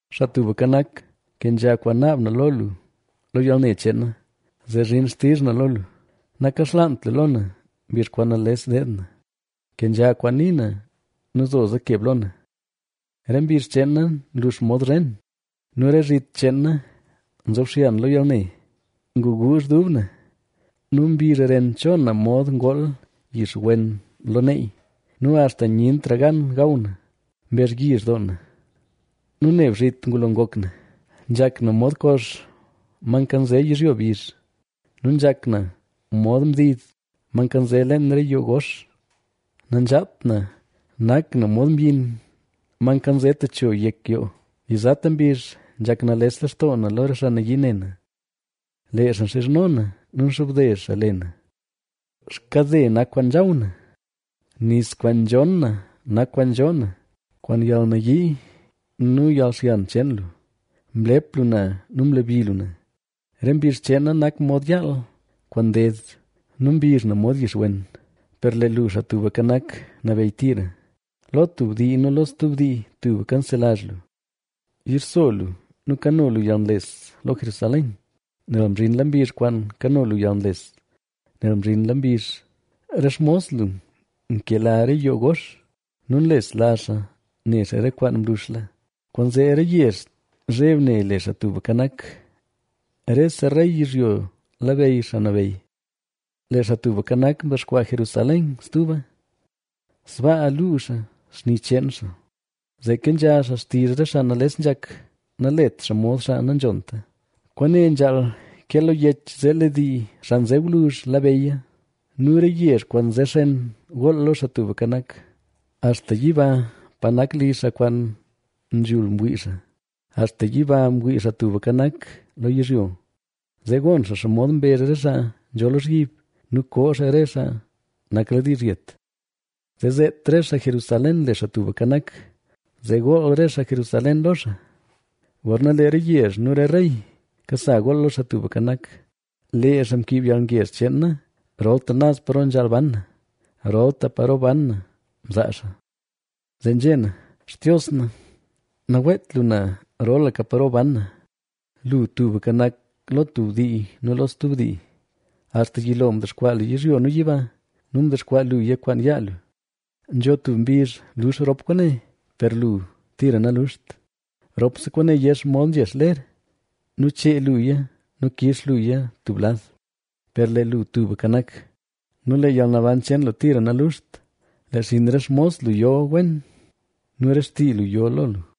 Xaa Tubka Nak, kenzha kwaan naab na lo lu lo yalne cheen na; zee zhin xtizh na lo lu. Nakaxlaant lu lo na, mbizh kwaan nales deed na; kenzha kwaan nii na nu zoza keb lo na. Re mbizh cheen na nlux mod zhen nu re zhit cheen na nzobxyan lo yalne. Nguguuzh dub na nu mbizh ren cho na mod ngool yix wen lo neey; nu axta nyentra gan gaw na. Mbezhyizh doo na nu neb zhit ngulo ngok na. Nzhak na mod kox, ma nkanze yizhyo bizh nu nzhak na mod mdid, ma nkanze leen re yoo gox. Nanzhaat na, nak na mod myin, ma nkanze techo yek yoo. Yizata mbizh nzhak nales lextoo na lo re xaa nayii ne na; lee xaa nxizhno na nu nxobde xaa le na. Xkade nak kwaan nzhaw na, nis kwaan nzhon na nak kwaan nzhoo na. Kwaan yalnayii nu yalxyan cheen lu, mlep lu na nu mlebi lu na. Re mbizh cheen na nak mod yaal kwaan nded nu mbizh na mod yixwen. Per lee lu, Xaa Tubka Nak, nabeyy tira, lo tub dii nu lo stub dii tubka nselazh lu. Yixso lu nu kano lu yalnles lo Jerusalén, nel mzhinla mbizh kwaan kano lu yalnles, nel mzhinla mbizh. Re xmos lu nkela re yoo gox nu nlesla xaa ne xaa re kwaan mluxla. Kwaanzee re yezh zheb ne le Xaa Tubka Nak, rese rey yizhyo labeyy Xaa Nabeyy. Lee Xaa Tubka Nak, dexkwaa Jerusalén stuba, sbaa luu xaa xni cheen xaa. Zee kenzha xaa xtizh re xaa nales nzhak, nalet xaa mod xaa nanzhonta. Kwaane nzhaal ke lo yech zee lee dii, xaa nze gwluzh labeyya nu re yezh kwaan nze xen gool lo Xaa Tubka Nak. Axta yiba pa nak li xaa kwaan nzhul mwii xaa; axta yiba mwii Xaa Tubka Nak lo yizhyo. Zee gon xaa xomod mbezh re xaa nzho lozhyib nu koo xaa re xaa nakladiizh yet; Zee zeet re xaa Jerusalén le Xaa Tubka Nak, zee gool re xaa Jerusalén lo xaa, gorna lee re yezh nu re rey, kasa gool lo Xaa Tubka Nak. Lee xaa mkiib yalngezh cheen na rolta naz paro nzhaal ban na; rolta paro ban na mzaa xaa. Zee nzhé na: “Xtios na, naweet lu na rolaka paro ban na. Lu tubka nak lo tub dii nu lo stub dii. Axta yilo lu mdexkwaa yizhyo nu yiba nu mdexkwaa luya kwaan yaa lu. Nzho tub mbizh lux rop kwaane, per lee lu tira naluxt. Ropse kwaane yex mod nzhex ler; nu chee luya nu kix luya tub lad. Per lee lu tubka nak; nu lee yalnaban cheen lu tira naluxt. Lee xinn re xmos lu yo wen nu re xtii lu yo lo lu.”